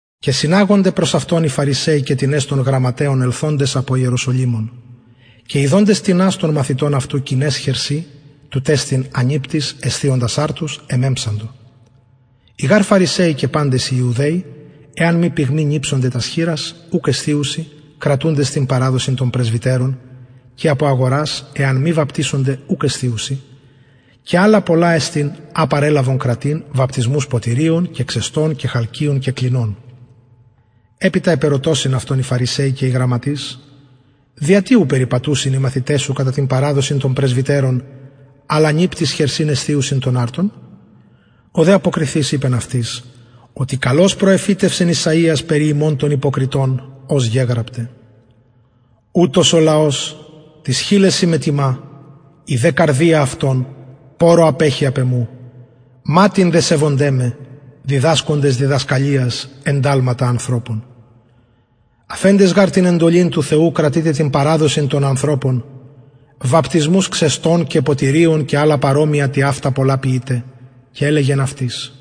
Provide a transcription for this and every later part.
και συναγονται προς αυτον οι φαρισαιοι και τινες των γραμματεων ελθοντες απο ιεροσολυμων και ιδοντες τινας των μαθητων αυτου κοιναις χερσιν τουτ εστιν ανιπτοις εσθιοντας αρτους εμεμψαντο οι γαρ φαρισαιοι και παντες οι ιουδαιοι εαν μη πυγμη νιψωνται τας χειρας ουκ εσθιουσιν κρατουντες την παραδοσιν των πρεσβυτερων και απο αγορας εαν μη βαπτισωνται ουκ εσθιουσιν και αλλα πολλα εστιν α παρελαβον κρατειν βαπτισμους ποτηριων και ξεστων και χαλκιων και κλινων επειτα επερωτωσιν αυτον οι φαρισαιοι και οι γραμματεις δια τι οι μαθηται σου ου περιπατουσιν κατα την παραδοσιν των πρεσβυτερων αλλα ανιπτοις χερσιν εσθιουσιν τον αρτον ο δε αποκριθεις ειπεν αυτοις οτι καλως προεφητευσεν ησαιας περι υμων των υποκριτων ως γεγραπται ουτος ο λαος τοις χειλεσιν με τιμα η δε καρδια αυτων πορρω απεχει απ εμου ματην δε σεβονται με διδασκοντες διδασκαλιας ενταλματα ανθρωπων αφεντες γαρ την εντολην του θεου κρατειτε την παραδοσιν των ανθρωπων βαπτισμους ξεστων και ποτηριων και αλλα παρομοια τοιαυτα πολλα ποιειτε και ελεγεν αυτοις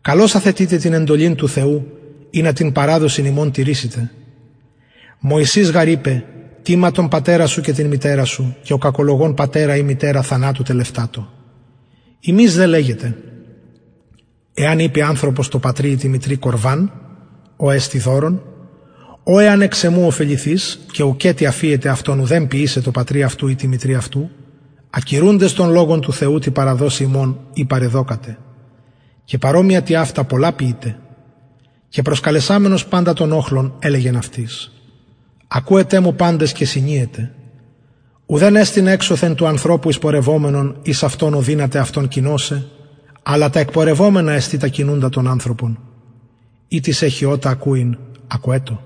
καλως αθετειτε την εντολην του θεου ινα την παραδοσιν υμων τηρησητε μωσης γαρ ειπεν τιμα τον πατερα σου και την μητερα σου και ο κακολογων πατερα η μητερα θανατω τελευτατω υμεις δε λεγετε εαν ειπη ανθρωπος τω πατρι η τη μητρι κορβαν ο εστιν δωρον ο εαν εξ εμου ωφεληθης και ουκετι αφιετε αυτον ουδεν ποιησαι τω πατρι αυτου η τη μητρι αυτου ακυρουντες τον λογον του θεου τη παραδοσει υμων η παρεδωκατε και παρομοια τοιαυτα πολλα ποιειτε και προσκαλεσαμενος παντα τον οχλον ελεγεν αυτοις ακουετε μου παντες και συνιετε ουδεν εστιν εξωθεν του ανθρωπου εισπορευομενον εις αυτον ο δυναται αυτον κοινωσαι αλλα τα εκπορευομενα απ αυτου εκεινα εστιν τα κοινουντα τον ανθρωπον ει τις εχει ωτα ακουειν ακουετω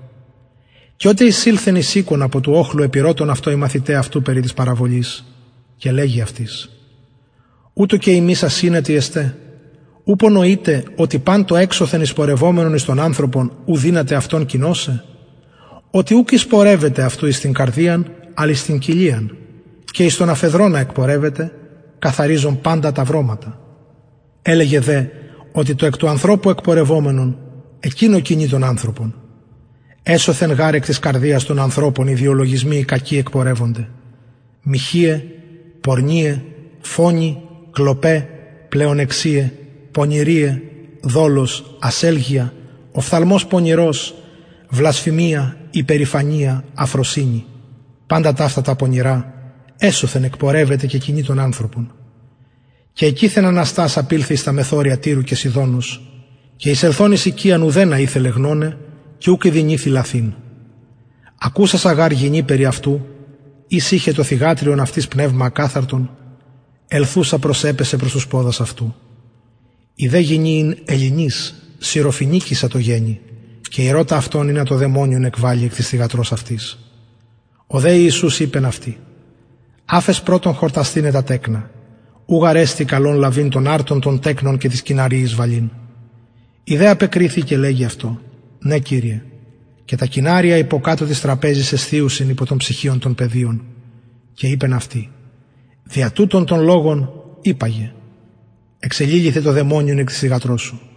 και οτε εισηλθεν εις οικον απο του οχλου επηρωτων αυτον οι μαθηται αυτου περι της παραβολης και λεγει αυτοις ουτως και υμεις ασυνετοι εστε ου νοειτε οτι παν το εξωθεν εισπορευομενον εις τον ανθρωπον ου δυναται αυτον κοινωσαι οτι ουκ εισπορευεται αυτου εις την καρδιαν αλλ εις την κοιλιαν και εις τον αφεδρωνα εκπορευεται καθαριζον παντα τα βρωματα ελεγεν δε οτι το εκ του ανθρωπου εκπορευομενον εκεινο κοινοι τον ανθρωπον εσωθεν γαρ εκ της καρδιας των ανθρωπων οι διαλογισμοι οι κακοι εκπορευονται μοιχειαι πορνειαι φονοι κλοπαι πλεονεξιαι πονηριαι δολος ασελγεια οφθαλμος πονηρος βλασφημια υπερηφανια αφροσυνη παντα ταυτα τα πονηρα εσωθεν εκπορευεται και κοινοι τον ανθρωπον και εκειθεν αναστας απηλθεν εις τα μεθορια τυρου και σιδωνος και εισελθων εις οικιαν ουδενα ηθελεν γνωναι και ουκ ηδυνηθη λαθειν ακουσασα γαρ γυνη περι αυτου ης ειχεν το θυγατριον αυτης πνευμα ακαθαρτον ελθουσα προσεπεσεν προς τους ποδας αυτου ην δε η γυνη ελληνις συραφοινικισσα τω γενει και ηρωτα αυτον ινα το δαιμονιον εκβαλη εκ της θυγατρος αυτης ο δε ιησους ειπεν αυτη αφες πρωτον χορτασθηναι τα τεκνα ου γαρ καλον εστιν λαβειν τον αρτον των τεκνων και βαλειν τοις κυναριοις η δε απεκριθη και λεγει αυτω ναι κυριε και γαρ τα κυναρια υποκατω της τραπεζης εσθιει απο των ψιχιων των παιδιων και ειπεν αυτη δια τουτον τον λογον υπαγε εξεληλυθεν το δαιμονιον εκ της θυγατρος σου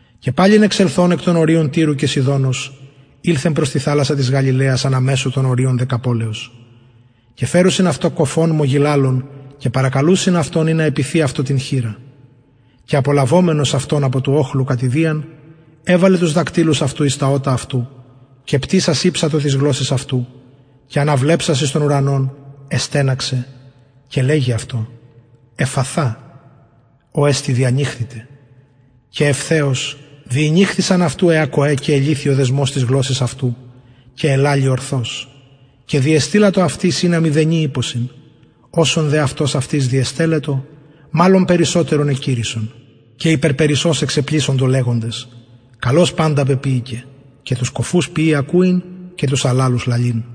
και παλιν εξελθων εκ των οριων τυρου και σιδωνος ηλθεν προς την θαλασσαν της γαλιλαιας ανα μεσον των οριων δεκαπολεως και φερουσιν αυτω κωφον μογγιλαλον και παρακαλουσιν αυτον ινα επιθη αυτω την χειρα και απολαβομενος αυτον απο του οχλου κατ ιδιαν εβαλεν τους δακτυλους αυτου εις τα ωτα αυτου και πτυσας ηψατο της γλωσσης αυτου και αναβλεψας εις τον ουρανον εστεναξεν και λεγει αυτω εφφαθα ο εστιν διανοιχθητι και ευθεως διηνοιχθησαν αυτου αι ακοαι και ελυθη ο δεσμος της γλωσσης αυτου και ελαλει ορθως και διεστειλατο αυτοις ινα μηδενι ειπωσιν οσον δε αυτος αυτοις διεστελλετο μαλλον περισσοτερον εκηρυσσον και υπερπερισσως εξεπλησσοντο λεγοντες καλως παντα πεποιηκεν και τους κωφους ποιει ακουειν και τους αλαλους λαλειν